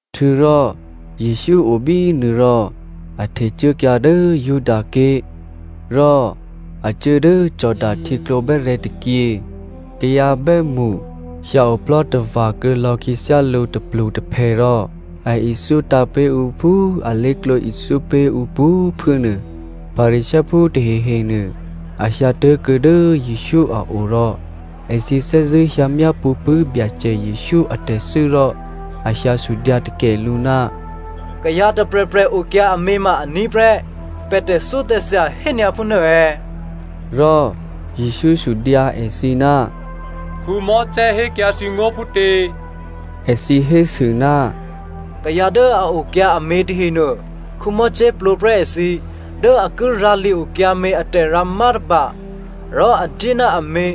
Htuô̌rò Jesǔ o bínuô rò a htecuốkyǎ dố Judaké̤ rò a cuố dố Jordano htyěklǒ bè́rè̤̌ tôkyě. Kayǎ bè́mṳ hyǎoplò́tava̤ kuô̌lò̌ khyěthyá lǔ tôplutôphè rò a ithyótǎ̤ pé̤ ǔ phú alé̤klǒ ithyó pé̤ ǔ pwǒ̤꤮ phuố nuô. Pharisěophú tahehenuô a hyǎ tố̤kuô̌ dố Jesǔ a o rò èthǐ thè́zṳ̂́ hyǎ myápṳ̌ pṳ̂́ Byacè Jesǔ atè̤thû́ rò a hyǎ sudyǎ takè lǔ, “Kayǎ tôprè̤prè̤ okyǎ amě ma aní̤ prè́ pè̤ tè̤thyótè̤thya hényǎ phúnuô è̌?” Rò Jesǔ sudyǎ èthǐ, “Mosè hékyǎ thǐ ngó̤ phútě?” Èthǐ hésû, “Kayǎ dố a okyǎ amě tahenuô Mosè plwǒprè́ èthǐ dố a ki rǎ li-okyǎmě a tè̤rǎmá tôba rò a dyé ná amě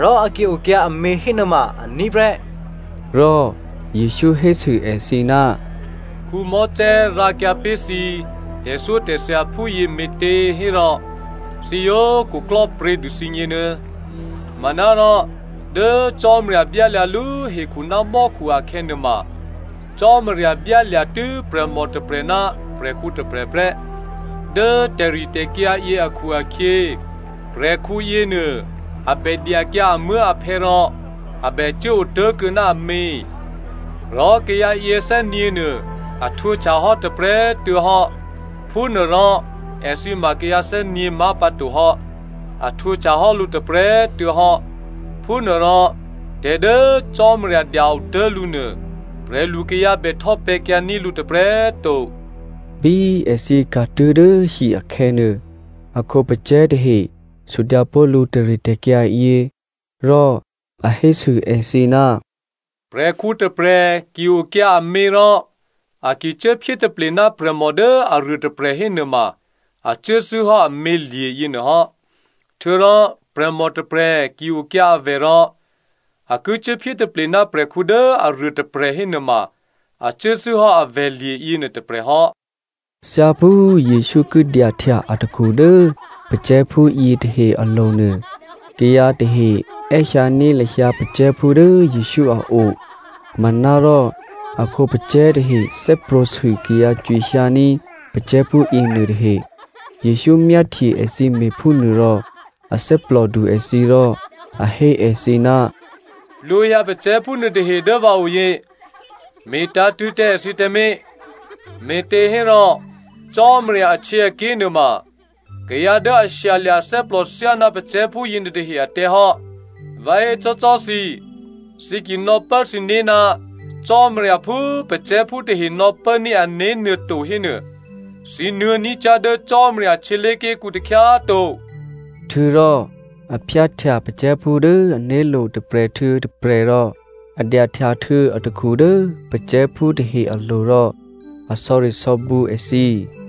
rò a ki okyǎ amě hénuôma aní̤ prè́.” Rò Jesǔ hésû èthǐ, “Mosè rǎkyǎ pé̤ thǐ tè̤thyótè̤thya phúyě me̤těhérò thǐ yǒ khuklò́pryě̤ dû thǐgně nuô. Manárò dố Cò́marya byálya̤lú hekhu ná mò́khu akhè̌nuôma ‘Cò́marya byálya̤tû́ prè̤mò tôprè̤ ná prè̤khǔ tôprè̤ prè́.’ ‘Dố tè̤ritè̤kyǎ yě akhu-akhyě prè̤khǔ yěnuô a bè dyakyǎ amuố̤aphè̌ rò a bè cuố otố̤kuô̌ ná amě, rò kayǎ yěthè́nyě̤nuô a htwǒhtyahò́ tôprè̤꤮ tuô̌hò́.’ Phúnuôrò èthǐ ma kayǎ thè́nyě̤ má̤pǎtohò́. A htwǒhtyahò́ lǔ tôprè̤꤮ tuô̌hò́. Phúnuôrò tè̤ dố Cò́marya dya-otố̤ lǔnuô, prè̤lukayǎ bè htò́pè̤̌kyǎní̤ lǔ tôprè̤꤮ to.” Bí èthǐ ka̤tuố̤ dố hi akhè̌nuô, a khǒpacè̤̌ tahe sudyǎpó̤ lǔ tè̤ritè̤kyǎ yě. Rò a hésû èthǐ, “Prè̤khǔ tôprè̤ ki okyǎ amě rò a ki cuốphyé taple ná prè̤mò dố aruôtôprè̤ hénuôma a cuốthû́hò́ amělye̤ yěnuô hò́. Htuô̌rò prè̤mò tôprè̤ ki okyǎ avè̤ rò a ki cuốphyé taple ná prè̤khǔ dố aruôtôprè̤ hénuôma a cuốthû́hò́ avè̤lye̤ yěnuô tôprè̤ hò́.” Thyáphú Jesǔ ki dyahtya atakhu dố pacè̤̌phú yětahe alo̤ nuô, kayǎ tahe è́hyǎní̤ lahyǎ pacè̤̌phú dố Jesǔ a o. Manárò a khǒpacè̤̌ tahe thè́prwǒ̤sû kayǎ cwihyǎní̤ pacè̤̌phú yěnuô tahe. Jesǔ myáhtye èthǐ me̤phúnuôrò a thè́plòdu èthǐ rò a hé èthǐ, “Plwǒhyǎ pacè̤̌phú nuôtahe dố vǎ oyě. Me̤tǎ̤tṳ̂̌ tǎ èthǐ tǎmé̤, me̤těhérò Cò́marya ahtyěaké̤ nuôma kayǎ dố a shyalya̤ athè́plò thyáná pacè̤̌phú yěnuôtahe atè̤hò́. Vǎ hécò́cò́ thǐ, thǐ ki nò̌pố thǐné̤ ná Cò́marya phú pacè̤̌phú tahe nò̌pốní̤ ané̤ nuôto hénuô, thǐ nuô̌ ní̤ cyá̤ dố Cò́marya htyělé̤ké̤kǔ takhyá꤮ to.” Htuô̌rò a phyáhtya pacè̤̌phú dố ané̤lo̤ tôprè̤ htuô̌ tôprè̤ rò a dyahtyahtuô̌ atakhu dố pacè̤̌phú tahe alo̤ rò a sò̌risò̌bǔ èthǐ.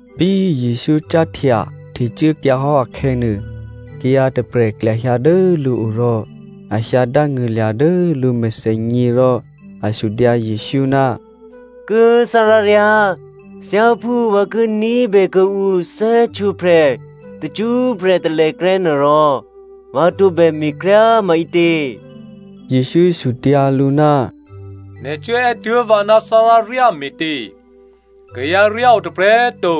Bí Jesǔ cáhtya htecuốkyǎhò́ akhè̌nuô, kayǎ tôprè̤ klyahyǎ dố lǔo rò a hyǎ dángṳ̂lya̤ dố lǔ mèthènyě rò a sudyǎ Jesǔ, “Kố꤮ tháráryá꤮ thyáphú vǎ ki ní̤bè kuô̌ǔ thè́htwǒprè̤ tacṳ́prè̤ talèkrè́ nuôrò, vǎ tǒbè me̤kryá꤮ maǐtě?” Jesǔ sudyǎ lǔ, “Nè̤ cuốè́ tuố̤ vǎ ná tháráryá me̤tě? Kayǎryá o tôprè̤꤮ to,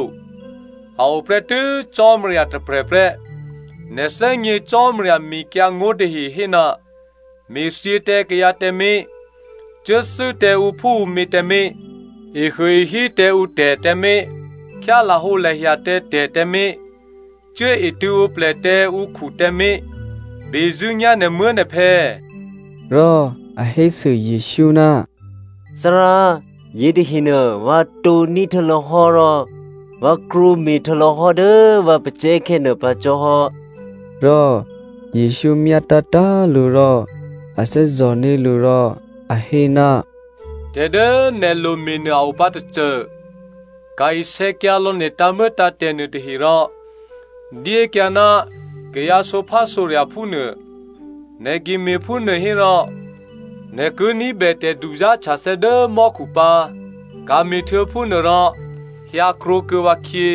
a o prè́tû́ Cò́marya tôprè̤prè́. Nè̤ thè́gně Cò́marya mekyǎngó̤ tahe hé, ‘Me̤thyě tǎ kayǎ tǎmé̤, cuốthû́ tǎ ǔphúǔmě tǎmé̤, ehuôehí tǎ ǔtè̤ tǎmé̤, khyá lahǒlahya tǎ tè̤ tǎmé̤, cuốetṳ̂̌ǒplè tǎ ǔkhu tǎmé̤, bezṳ̂́nyá̤ nè̤muố̤nè̤phè̌.’” Rò a hésû Jesǔ, “Thárá꤮ yětahenuô vǎ tǒ̤ní̤ htuô̌lò̌hò́ rò vǎ krwǒme̤ htuô̌lò̌hò́ dố vǎ pacè̤̌khè̌ nuô pǎ cò́hò́.” Rò Jesǔ myá tǎ̤tǎ̤꤮ lǔ rò a thè́zò̤ní̤ lǔ rò a hé, “Tè̤ dố nè̤ lome̤ nuô a opǎ tôcô, ka̤ isè̌kyǎlò̌ nè̤ tǎ̤muô̌tǎ̤tè̤ nuôtahe rò dyékyǎ ná kayǎ sǒphásǒrya̤phú nuô. Nè̤ ki me̤phúnuô hérò nè̤ ki ní̤bè tè̤duzá̤htyathè̌ dố mò́khu pǎ. Ka̤me̤htuô̌ phúnuô rò hyǎ krwǒkuô̌ vǎkhyě.”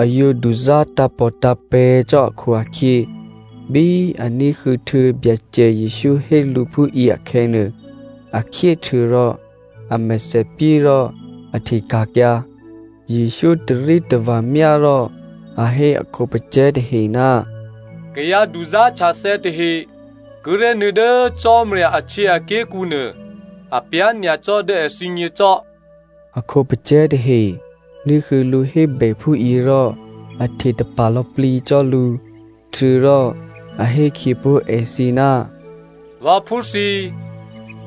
A yǒ duzá̤ tǎ̤pòtǎ̤pè̤̌ cò́ akhu-akhyě, bí a ní̤huô̌ htuô̌ Byacè Jesǔ hé lǔ phúyě akhè̌nuô, a khyé htuô̌rò a mèthèpyé rò a hteka̤kyǎ. Jesǔ tarítava̤ myá rò a hé a khǒpacè̤̌ tahe, “Kayǎ duzá̤htyathè̌ tahe kíré̤ nuô̌ dố Cò́marya ahtyěaké̤kǔ nuô, apyá̤ nyacò́ dố èthǐgně cò́!” A khǒpacè̤̌ tahe ní̤huô̌ lǔ hébè phúyě rò a htetapa̤ lò̌plǐ cò́ lǔ. Htuô̌rò a hé khyěpó̤ èthǐ, “Vǎphú thǐ꤮,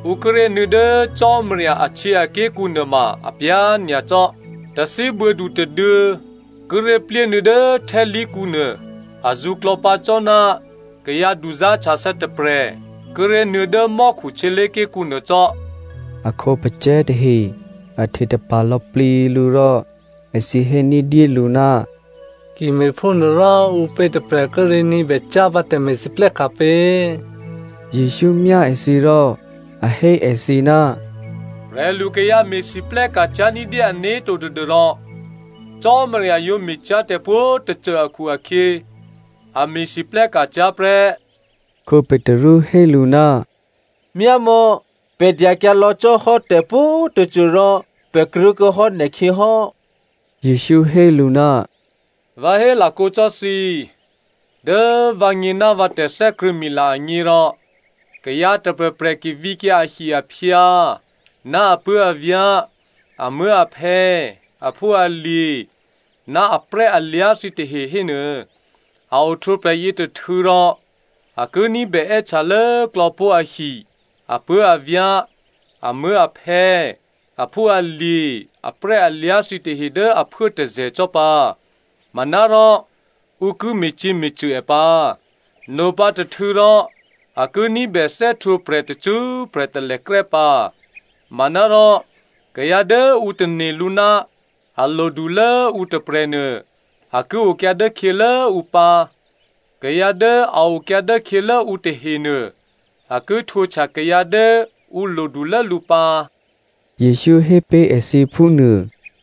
ǔ kíré̤ nuô̌ dố Cò́marya ahtyěaké̤kǔ nuôma apyá̤ nyacò́꤮. Tathíbuô̌du tôduô̌ kíré̤ plyénuô̌ dố htè́khǎlí̤kǔnuô azǔ klò̌pǎ cò́ ná kayǎ duzá̤htyathè̌ tôprè̤ kíré̤ nuô̌ dố mò́khu htyělé̤ké̤kǔ nuô cò́.” A khǒpacè̤̌ tahe a hte tapa̤ lò̌plǐ lǔ rò èthǐ hé ní̤dyélǔ, “Ki me̤phúnuôrò ǔpě tôprè̤ kíré̤ ní̤bècyá̤pǎ tè̤me̤lwóhteka̤ pě?” Jesǔ myá èthǐ rò a hé èthǐ, “Prè̤lukayǎ me̤lwóhteka̤ cyá̤ ní̤dyé ané̤to tadû́rò Cò́marya yǒ me̤cyá̤tè̤ pwǒ̤꤮ tôcô akhu-akhyě, a me̤lwóhteka̤ cyá̤ prè́.” Petru hé lǔ, “Myámò̌, pè̤ dyakyǎ lò̌ cò́hò́ tè̤pwǒ̤꤮ tôcô rò pè̤ krwǒkuô̌hò́ nè̤khyěhò́.” Jesǔ hé lǔ, “Vǎ hélakǒ cò́ thǐ, dố vǎgně ná vǎ tè̤thè́krṳ̂̌mila agně rò kayǎ tôprè̤prè̤ ki vǐkyǎ ahi-aphyǎ ná apuố̤avyá̤, amuố̤aphè̌, aphúalye̤, ná aprè́alyá̤ thǐtahe hénuô, a ohtwǒprè̤ yětôhtû̌rò, a ki ní̤bè è́htya lốklò̌pó̤ ahi, apuố̤avyá̤, amuố̤aphè̌, aphúalye̤, aprè́alyá̤ thǐtahe dố aphuố tôzè̤ cò́ pǎ. Manárò ǔ ki me̤cyě̤me̤cṳ̂ è pǎ. Nopǎ tôhtû̌ rò a ki ní̤bè thè́htwǒprè̤ tacṳ́prè̤ talèkrè́ pǎ. Manárò kayǎ dố ǔ tane̤ lǔ ná a lodulố ǔtôprè̤nuô, a ki okyǎ dốkhyělố ǔ pǎ, kayǎ dố a okyǎ dốkhyělố ǔ tahenuô a ki htwǒhtya kayǎ dố ǔ lodulố lǔ pǎ,” Jesǔ hé pé̤ èthǐ phú nuô.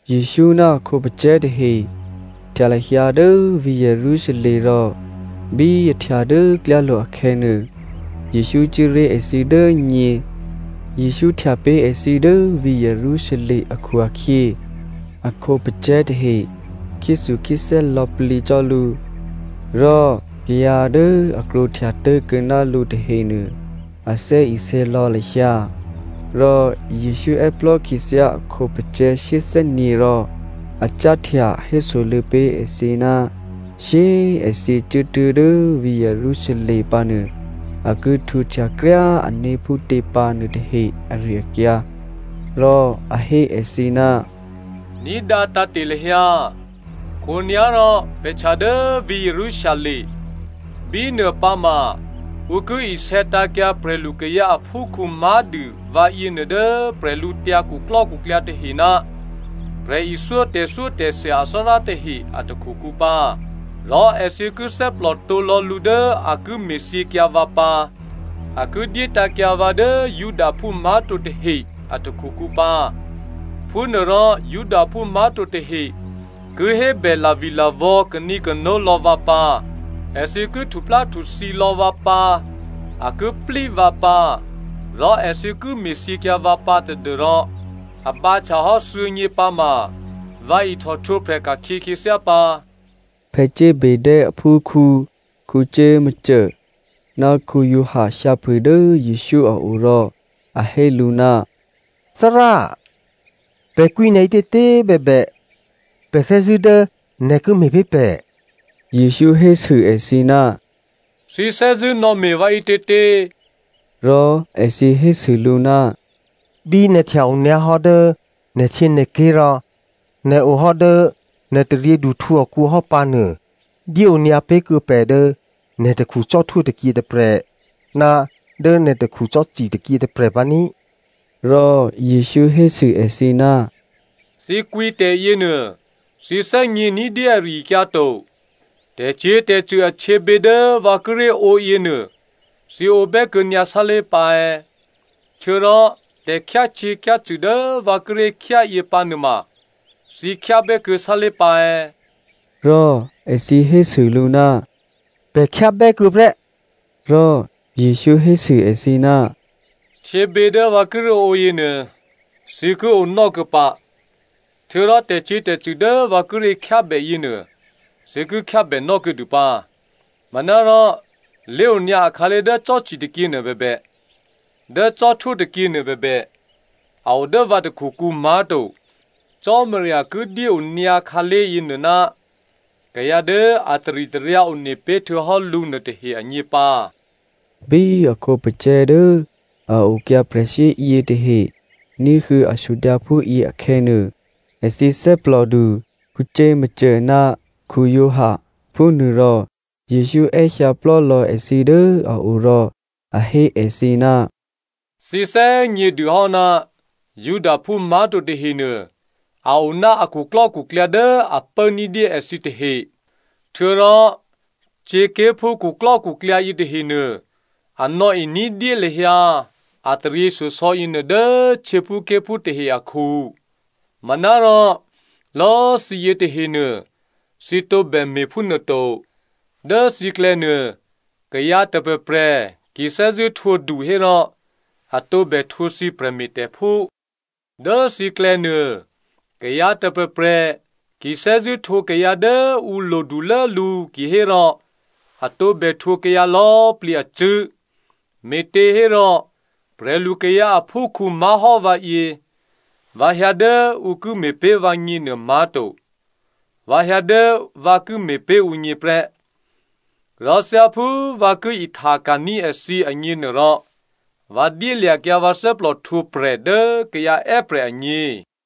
Jesǔ ná a khǒpacè̤̌ tahe htya lahyǎ dố vǐ̤ Jerusalem rò bí a htya dố klyálo̤ akhè̌nuô, Jesǔ cuố ré̤ èthǐ dố nyě. Jesǔ htya pé̤ èthǐ dố vǐ̤ Jerusalem akhu-akhyě, a khǒpacè̤̌ tahe khyéthukhyéthè́ lò̌plǐ cò́ lǔ, rò kayǎ dố a krwǒhtya tố̤kuô̌ ná lǔ tahenuô, a thè́isě lò̌ lahyǎ. Rò Jesǔ è́plò́ khyěthyá a khǒpacè̤̌ shyéthè́nyě̤ rò a cáhtya hésoluô̌ pé̤ èthǐ ná shyé꤮ èthǐ cuốtuố̤ dố vǐ̤ Jerusalem pǎnuô a ki htwǒhtya kryá꤮ ané̤ phútě pǎ nuôtahe ari-akyǎ. Rò a hé èthǐ, “Ní̤dǎ tǎ̤te̤ lahyǎ, khǒnyá̤ rò pè̤ htya dố vǐ̤ Jerusalem. Bínuô pǎma ǔ ki isè̌tǎ̤kyǎ prè̤lukayǎ aphúkhǔ má̤dû vǎyěnuô dố bwídukhu tahe ná prè̤ithyó tè̤thyótè̤thya athárá tahe a takhukǔ pǎ. Rò èthǐ ki thè́plò tǒ lò̌ lǔ dố a ki me̤thyěkyǎ vǎ pǎ. A ki dyétǎ̤kyǎ vǎ dố Judaphú má̤to tahe a takhukǔ pǎ. Phúnuôrò Judaphú má̤to tahe ki hébè lavilavò̌ kanǐkano lò̌ vǎ pǎ, èthǐ ki htupláhtuthǐ lò̌ vǎ pǎ, a ki plí vǎ pǎ, rò èthǐ ki me̤thyěkyǎ vǎ pǎ tadû́rò a bǎhtyahò́ thuô̌nyě pǎma vǎ ihtòhtwǒprè̤ ka̤khyě khyěthyá pǎ.” Zebedeo aphúkhǔ Jakomo ná Giovanni hyǎphû dố Jesǔ a o rò a hé lǔ, “Thárá꤮ pè̤ kwǐ nè̤ ǐtětě bèbè, pè̤ thè́zṳ̂́ dố nè̤ ki me̤ pé̤ pè̤.” Jesǔ hésû èthǐ, “Thǐ thè́zṳ̂́ nò̌me̤ vǎ ǐtětě?” Rò èthǐ hésû lǔ, “Bí nè̤ htya onyǎhò́ dố nè̤htyěnè̤ké̤ rò nè̤ ohò́ dố nè̤taryěduhtǔ akǔ hò́ pǎnuô, dyéonyǎ pé̤kuô̌ pè̤ dố nè̤ takhu cò́htwó tôkyě tôprè̤, ná dố nè̤ takhu cò́ci tôkyě tôprè̤ pǎ ní꤮.” Rò Jesǔ hésû èthǐ, “Thǐ kwǐ tè̤yěnuô thǐ thè́gně ní̤dyé ari-akyǎ to. Tè̤cyě̤tè̤cṳ̂ ahtyěbě dố vǎ kíré̤ ǒ yěnuô thǐ ǒ bè́kuô̌nyǎ sálé̤ pǎ è̌? Htuô̌rò tè̤khyácyě̤khyácṳ̂ dố vǎ kíré̤ khyá yě pǎ nuôma thǐ khyábè́kuô̌ sálé̤ pǎ è̌?” Rò èthǐ hésû lǔ, “Pè̤ khyábè́kuô̌ prè́.” Rò Jesǔ hésû èthǐ, “Htyěbě dố vǎ kíré̤ ǒ yěnuô thǐ ki ǒnò́kuô̌ pǎ, htuô̌rò tè̤cyě̤tè̤cṳ̂ dố vǎ kíré̤ khyábè yěnuô thǐ ki khyábènò́ kuô̌dû pǎ. Manárò lé̤onyǎ akhǎlé̤ dố cò́ci tôkyě nuô bèbè, dố cò́htwó tôkyě nuô bèbè, a o dố vǎ takhukǔ má̤to, Cò́marya ki dyéonyǎ khǎlé̤ yěnuô ná kayǎ dố a taritaryǎ one pé̤htuô̌hò́ lǔ nuôtahe agně pǎ.” Bí a khǒpacè̤̌ dố a okyǎ prè̤shyé yětahe ní̤huô̌ a sudyǎ phúyě akhè̌ nuô, èthǐ thè́plòdu Jakomo ná Giovanni. Phúnuôrò Jesǔ è́hyǎ plò́lò̌ èthǐ dố a o rò a hé èthǐ, “Thǐ thè́gně dûhò́ ná Judaphú má̤to tahenuô a o ná a khuklò́khuklyǎ dố a pố ní̤dyé èthǐ tahe. Htuô̌rò htyěké̤phú khuklò́khuklyǎ yětahenuô a nò̌e ní̤dyé lahyǎ a taryěshyosò̌ yěnuô dố htyěphúké̤phú tahe akhu. Manárò lò̌꤮ thǐ yětahenuô thǐ tǒbè me̤phúnuô to. Dố thǐklè̌nuô, kayǎ tôprè̤prè̤ ki thè́zṳ̂́ htwǒdu hérò a tǒbè htwǒ thǐ prè̤me̤tè̤phú. Dố thǐklè̌nuô, kayǎ tôprè̤prè̤ ki thè́zṳ̂́ htwǒ kayǎ dố ǔ lodulố lǔ kihérò a tǒbè htwǒ kayǎ lò̌꤮ plǐ acṳ̂́. Me̤těhérò prè̤lu kayǎ aphúkhǔ má̤hò́ vǎyě, vǎ hyǎ dố ǔ ki me̤pé̤ vǎgně nuô má̤to. Vǎ hyǎ dố vǎ ki me̤pé̤ ǔgně prè́. Rò thyáphú vǎ ki ihtaka̤ní̤ èthǐ agněnuôrò, vǎ dyélya̤kyǎ vǎ thè́plò htwǒprè̤ dố kayǎ è́prè̤ agně.”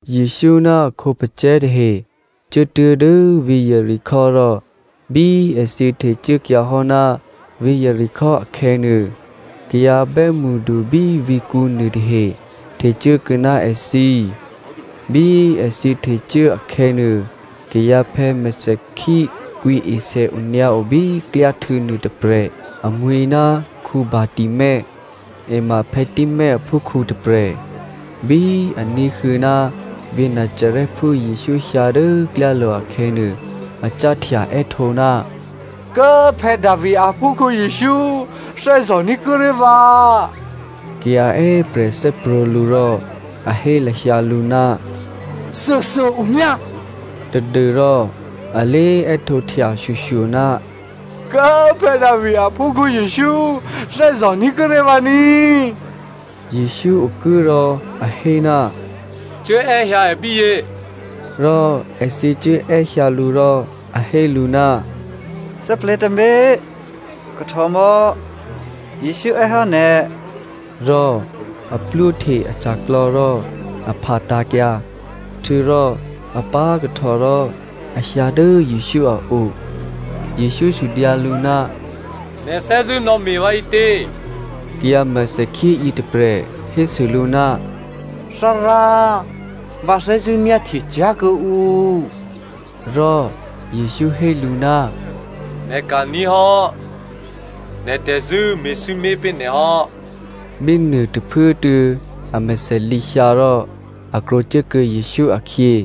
Jesǔ ná a khǒpacè̤̌ tahe cuốtuố̤ dố vǐ̤ Jeriko rò bí èthǐ htecuốkyǎhò́ ná vǐ̤ Jeriko akhè̌nuô, kayǎ bè́mṳdu bí vǐ̤kǔ nuôtahe htecuố kuô̌ ná èthǐ. Bí èthǐ htecuố akhè̌nuô, kayǎphè̌ mèthèkhí kwǐesè onyǎo bí klyáhtû̌nuô tôprè̤. Amwi̤ ná Bartimeo, è ma Timeo aphúkhǔ tôprè̤. Bí a ní̤huô̌ ná vǐ̤ Nazarèphú Jesǔ hyǎ dố klyálo̤ akhè̌nuô, a cáhtya è́htǒ, “Kố꤮ Davi aphúkhǔ Jesǔ꤮ thè́zò̤ní̤ kuô̌ ré̤ vǎ.” Kayǎ è́prè̤ thè́prwǒ̤ lǔ rò a hé lahyǎ lǔ, “Thuôthuô꤮ omyá꤮” tadû́rò a lé è́htǒhtya shyoshyo, “Kố꤮ Davi aphúkhǔ Jesǔ꤮ thè́zò̤ní̤ kuô̌ ré̤ vǎ ní꤮.” Jesǔ okuố rò a hé, “Cuốè́hyǎ è bíyě” rò èthǐ cuố è́hyǎ lǔ rò a hé lǔ, “Thè́plè̤̌ tǎmé̤, kahtòmò̌, Jesǔ è́ hò́ nè̤.” Rò a plwóhte aca̤klò̌ rò a phatǎ̤kyǎ. Htuô̌rò a pá̤kahtò rò a hyǎ dố Jesǔ a o. Jesǔ sudyǎ lǔ, “Nè̤ thè́zṳ̂́ nò̌me̤ vǎ maǐtě?” Kayǎ mèthèkhí yětôprè̤ hésû lǔ, “Thárá꤮ vǎ thè́zṳ̂́ myáhtye cyá̤ kuô̌ǔ.” Rò Jesǔ hé lǔ, “Nè̤ ka̤ní̤ hò́. Nè̤ tè̤zṳ̂́ me̤sǐmé̤ pé̤ nè̤ hò́.” Bínuô tôphuốtuô̌ amèthè lǐhyǎ rò a krwǒcuốkuô̌ Jesǔ akhyě.